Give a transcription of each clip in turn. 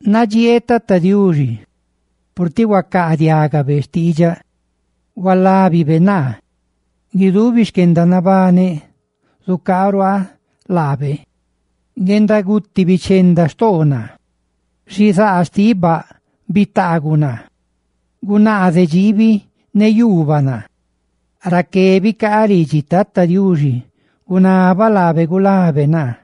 Nadxieeꞌ Tata Diuxi purtiꞌ huacaadiágabe xtiidxaꞌ, purtiꞌ hualábibe naa. ¡Guidubi xquendanabaneꞌ zucaaruaa laabe! Guendaguti bichenda xtoo naa, xizaa xtiꞌ baꞌ bitaaguꞌ naa, ne gunaaze dxiibi ne yuubaꞌ naa. Raqué bicaaꞌ ridxi Tata Diuxi, ne gunabaꞌ laabe gulabe naa.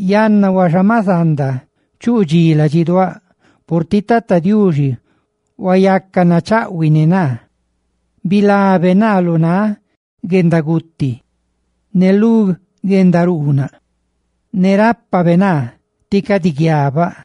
Yanna huaxa, maꞌ zanda chuꞌ dxí ladxiduáꞌ purtiꞌ Tata Diuxi huayaca nachaꞌhuiꞌ ne naa, bilabe naa lu náꞌ guendaguti, bilabe naa lu guendaruunaꞌ tí cadi guiabaꞌ.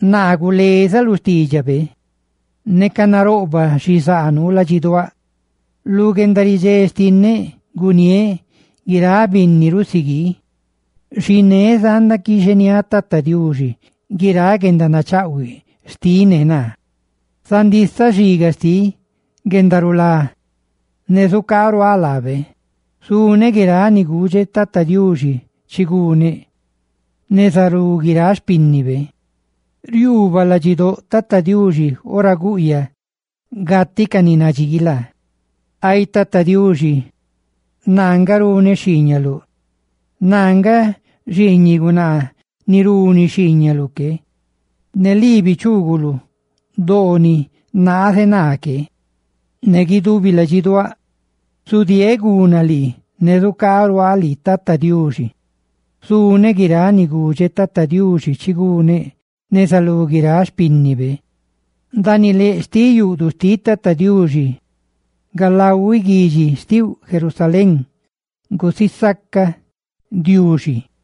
Naa, gulezaꞌ lu xtiidxabe neca naroꞌbaꞌ xizaa nuu ladxiduáꞌ. Lu guendaridxé xtinneꞌ guniéꞌ guiráꞌ binni rusiguii. Xiné zanda quixeniáꞌ Tata Diuxi guiráꞌ guendanachaꞌhuiꞌ xtiꞌ ne naa. ¡Zandisaꞌ xiga xtiꞌ guendarulá ne zucaaruaa lábe! Zuneꞌ guiráꞌ ni gudxeꞌ Tata Diuxi chi guneꞌ neza lú guiráꞌ xpínnibe. Riuubaꞌ ladxidóꞌ Tata Diuxi ora guꞌyaꞌ gatiꞌ ca ni nadxii laa. ¡Ay Tata Diuxi, naa nga runeꞌ xhiiñaluꞌ! ¡Naa nga xiiñiꞌ gunaa ni runi xhiiñaluꞌ que! Ne lii bichuuguluꞌ doo ni naaze naa que. Ne guidubi ladxiduáꞌ, zudieeꞌ guna lii, ne zucaaruaa lii, Tata Diuxi. Zuneꞌ guiráꞌ ni gudxeꞌ Tata Diuxi chi guneꞌ neza lú guiráꞌ xpínnibe, ndaaniꞌ leꞌ xtiꞌ yuꞌduꞌ xtiꞌ Tata Diuxi, ¡galahuiꞌ guidxi xtiuꞌ, Jerusalén! ¡Guisaca Diuxi!